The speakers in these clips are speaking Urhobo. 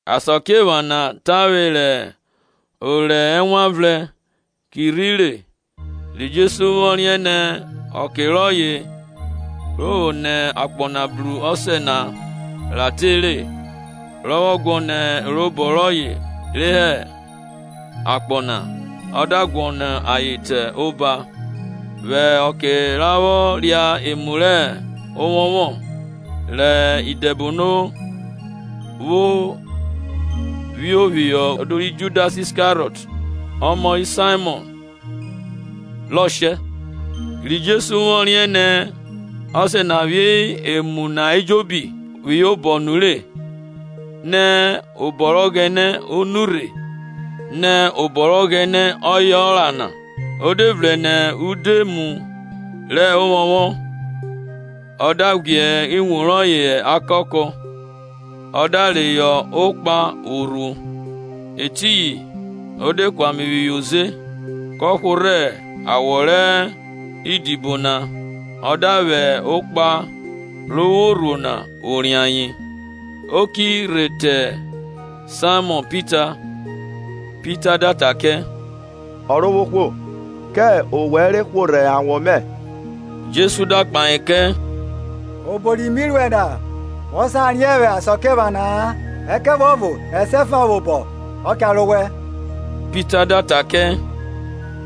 Asakiephana tavwe rẹ orẹ rẹ Ewanvrẹn ki rhi te, ri Jesu vwọ riẹn nẹ ọke rọye vwo nẹ akpọ na bru Ọsẹ na ra tere, rọ vwọ guọnọ erobọ rọye re hẹ akpọ na, ọ da guọnọ ayen te oba. Vwẹ ọke ra vwo ria emu rẹ ovwọnvwọn, rẹ idẹbono vwo phio phihọ udu ri Judas Iskariọt, ọmọ ri Saimọn, rọ shẹ, ri Jesu vwọ riẹn nẹ Ọsẹ na phi emu na ejobi phihọ obọ nure, nẹ obọ rẹ Ọghẹnẹ o nurhe nẹ obọ rẹ Ọghẹnẹ ọye ra na, o de vrẹn nẹ udoemu rẹ ovwọnvwọn na, ọ da ghwiẹ iwun rọye hẹ akakọ, ọ da reyọ okpan vwo rhuo. Etiyin o de ku ame phihọ oze, kọ hworhẹ awọ rẹ idibo na ọ da vwẹ okpan ro vwo rhuo na vwo rie ayen. O ki rhe te Saimọn Pita; Pita da ta kẹ, Ọrovwohwo, kẹ owẹ re hworhẹ awọ mẹ? Jesu da kpahe kẹ, Ọbo ri mi ruẹ na wọ sa riẹn vwẹ asakiephana-a, ẹkẹvuọvo esiẹfa vwobọ ọ cha ro owẹ. Pita da ta kẹ,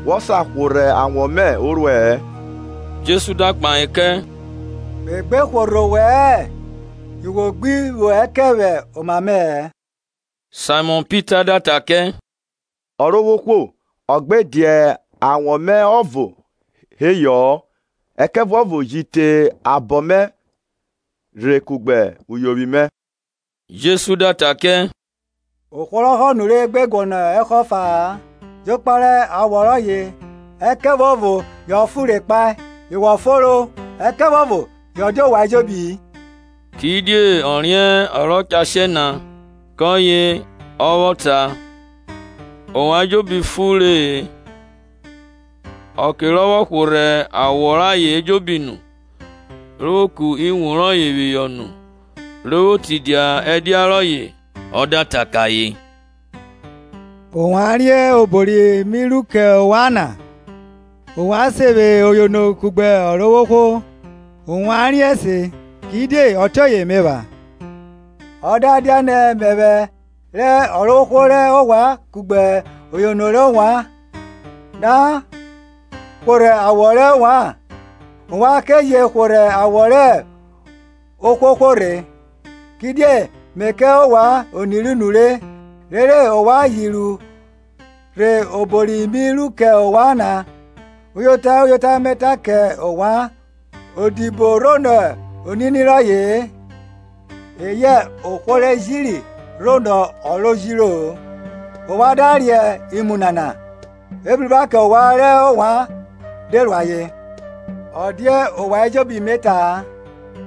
Wo sa hworhẹ awọ mẹ o ruẹ Jesu da kpahe kẹ, Me gbe hworhẹ owẹ-ẹ, yu wo gbi vwo ẹkẹn vwẹ oma mẹ-ẹ. Saimọn Pita da ta kẹ, Ọrovwohwo, ọ gbe dia awọ mẹ ọvo heyọ-ọ ẹkẹvuọvo ji te abọ mẹ rhe kugbe uyovwi mẹ. Jesu da ta kẹ, Ohwo rọ họ nure gbe guọnọ ẹhọ ọfa-a, jokpa rẹ awọ rọye, ẹkẹvuọvo yọ fonre kpae; yo wọ fonro, ẹkẹvuọvo yọ dia ovwan ejobi-i. Kidie ọ riẹn ọ rọ cha shẹ na; kọye ọ vwọ ta, Ovwan ejobi fonre-e. Ọke rọ vwọ hworhẹ awọ rayen ejobi nu, ro vwo ku iwun rọye phihọ nu, ro vwo tidia ẹdia rọye, ọ da ta kẹ ayen, Ovwan riẹn obo ri mi ruẹ kẹ ovwan na? Ovwan se vwe Oyono kugbe Ọrovwohwo; ovwan riẹn se, kidie ọtiọye me epha. Ọ da dianẹ, mẹvwẹ rẹ Ọrovwohwo rẹ ovwan kugbe Ọyono rẹ ovwan, da hworhẹ awọ rẹ ovwan, ovwan ke je hworhẹ awọ rẹ ohwohwo rhe. Kidie mẹ kẹ ovwan oniru nure, rere ovwan ji ru obo ri mi ru kẹ ovwan na rhe. Uyota, uyota, me ta kẹ ovwan, odibo rhonọ onini rọye-e, eyẹ ohwo re jiri rhonọ ọ ro jiro-o. Ovwan da riẹn imu nana, ebruba kẹ ovwan rẹ ovwan de ru ayen. Ọ dia ovwan ejobi me ta-a;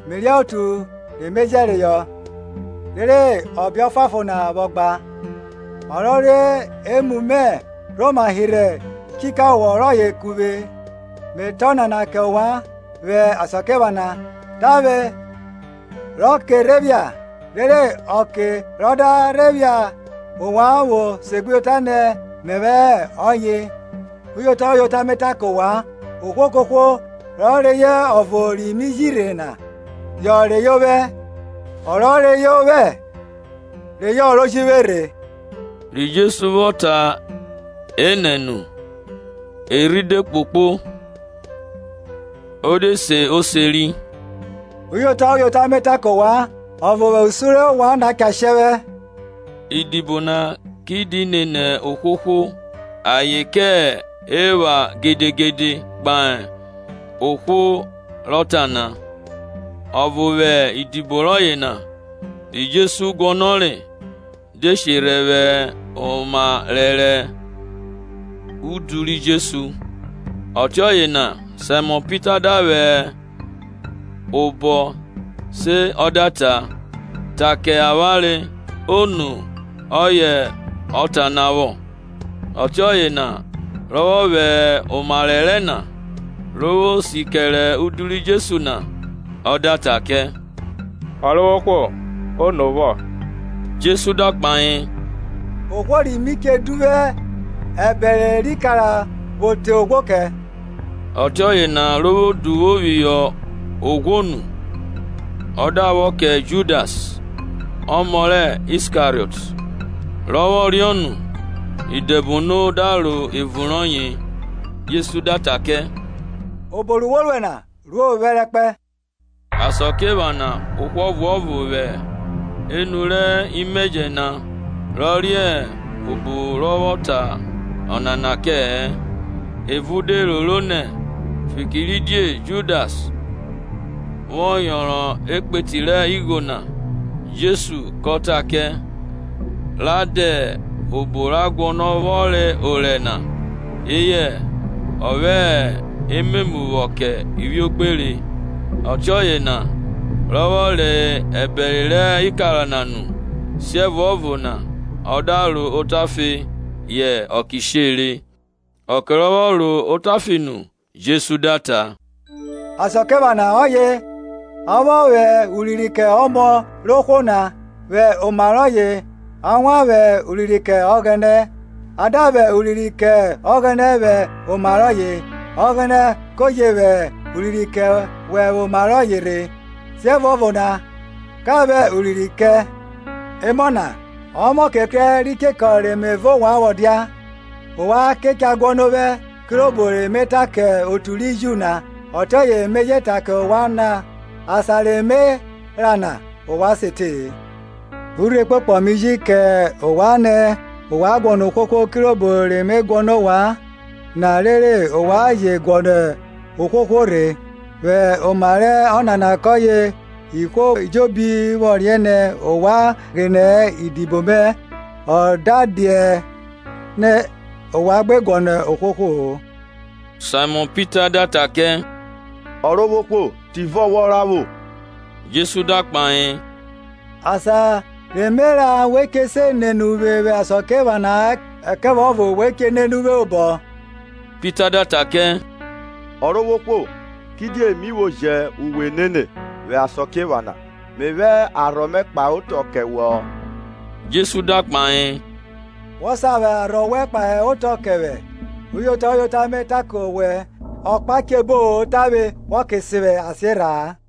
me riẹn otu re me jẹreyọ; rere ọbe ọfuanfon na vwọ gba, Ọ rọ re emu mẹ rhoma hirhe ichukawo rọye ku vwẹ. Me ta ọnana kẹ ovwan vwẹ asakiephana, tavwe rọ ke rhe phia, rere ọke rọ da rhe phiare ovwan vwo segbuyota nẹ mẹvwẹ hẹ ọye. Uyota, uyota, me ta kẹ ovwan, ohwo kohwo rọ reyọ ọvo ri mi ji rhe na yọ reyọ ovwẹ; ọ rọ reyọ ovwẹ reyọ ọ ro ji vwe rhe. Ri Jesu vwọ ta eta nana nu, erhi de kpokpo, o de se oseri, Uyota, uyota, me ta kẹ ovwan, ọvo vwẹ usun rẹ ovwan na cha shẹ vwẹ. Idibo na ki di nẹ ohwohwo, ayen ke epha gedegede kpahe ohwo rọ ta na. Ọvo vwẹ idibo rọye na, ri Jesu guọnọre, de sherhẹ vwẹ oma rẹrẹ udu ri Jesu; ọtiọye na Saimọn Pita da vwẹ obọ se ọ da ta, Ta kẹ avwanre ono ọye ọ ta na vwo. Ọtiọye na rọ vwọ vwẹ oma rẹrẹ na, ro vwo si kẹre udu ri Jesu na, ọ da ta kẹ Ọrovwohwo, ono vwo? Jesu da kpahe, Ohwo ri mi che duvwu ẹbẹre rẹ ikara vwo te oghwo kẹ. Ọtiọye na ro vwo duvwo phihọ oghwo nu, ọ da vwọ kẹ Judas, ọmọ rẹ Iskariọt. Rọ vwọ riọ nu, Idẹbono da ro evun rọye. Jesu da ta kẹ, obo ru wo ruẹ na, ruo phẹrẹkpẹ. Asakiephana o vwo ohwo ọvuọvo vwẹ enu rẹ imẹjẹ na rọ riẹn obo ro vwọ ta onana kẹ-ẹ. Evo de roro nẹ, fikiridie Judas vwọ yọnrọn ekpu rẹ igho na, Jesu kọ ta kẹ, Ra dẹ obo ra guọnọ vwọ re orẹ na; eyẹ, ọ vwẹ ememu vwọ kẹ ivwiogbere. Ọtiọye na, rọ vwọ re ẹbẹre rẹ ikara na nu, siẹvuọvo na ọ da ro otafe; yẹ ọke shere. Ọke rọ vwọ ro otafe nu, Jesu da ta, Asakiephana ọye a vwọ vwẹ urinrin kẹ Ọmọ rẹ ohwo na, vwẹ oma rọye a wan vwẹ urinrin kẹ Ọghẹnẹ; a da vwẹ urinrin kẹ Ọghẹnẹ vwẹ oma rọye, Ọghẹnẹ kọ je vwẹ urinrin kẹ vwẹ oma rọye rhe, siẹvuọvo na kọ vwẹ urinrin kẹ. Emọ na, ọmọke krẹ ri chekọ re mẹ vẹ ovwan vwọ dia. Ovwan cha guọnọ ovwẹ; kirobo re me ta kẹ otu ri Ju na ọtiọye me je ta kẹ ovwan na. Asan re me ra na ovwan se te-e. Urhi ọkpokpọ mi ji kẹ ovwan nẹ, ovwan guọnọ ohwohwo; kirobo re me guọnọ ovwan na ọtiọye ovwan je guọnọ ohwohwo rhe. Vwẹ oma rẹ ọnana kọye ihwo ejobi vwọ riẹn nẹ ovwan gbine idibo me, ọ da dianẹ ovwan guọnọ ohwohwo. Saimọn Pita da ta kẹ, Ọrovwohwo, Tivọ wọ ra vwo? Jesu da kpahe, Asan re me ra we che se nene uvwe vwẹ asakiephana-a; ẹkẹvuọvo we che nene uvwe vwobọ. Pita da ta kẹ, Ọrovwohwo, kidie mi vwo jẹ uwe enene vwẹ asakiephana? Me vwẹ arhọ mẹ kpahe otọ kẹ wẹ. Jesu da kpahe, Wọ sa vwẹ arhọ wẹn kpahe otọ kẹ vwẹ? Uyota, uyota me ta kẹ owẹ, ọhọ che bo-o tavwe wọ ke sen vwẹ asiarha-a.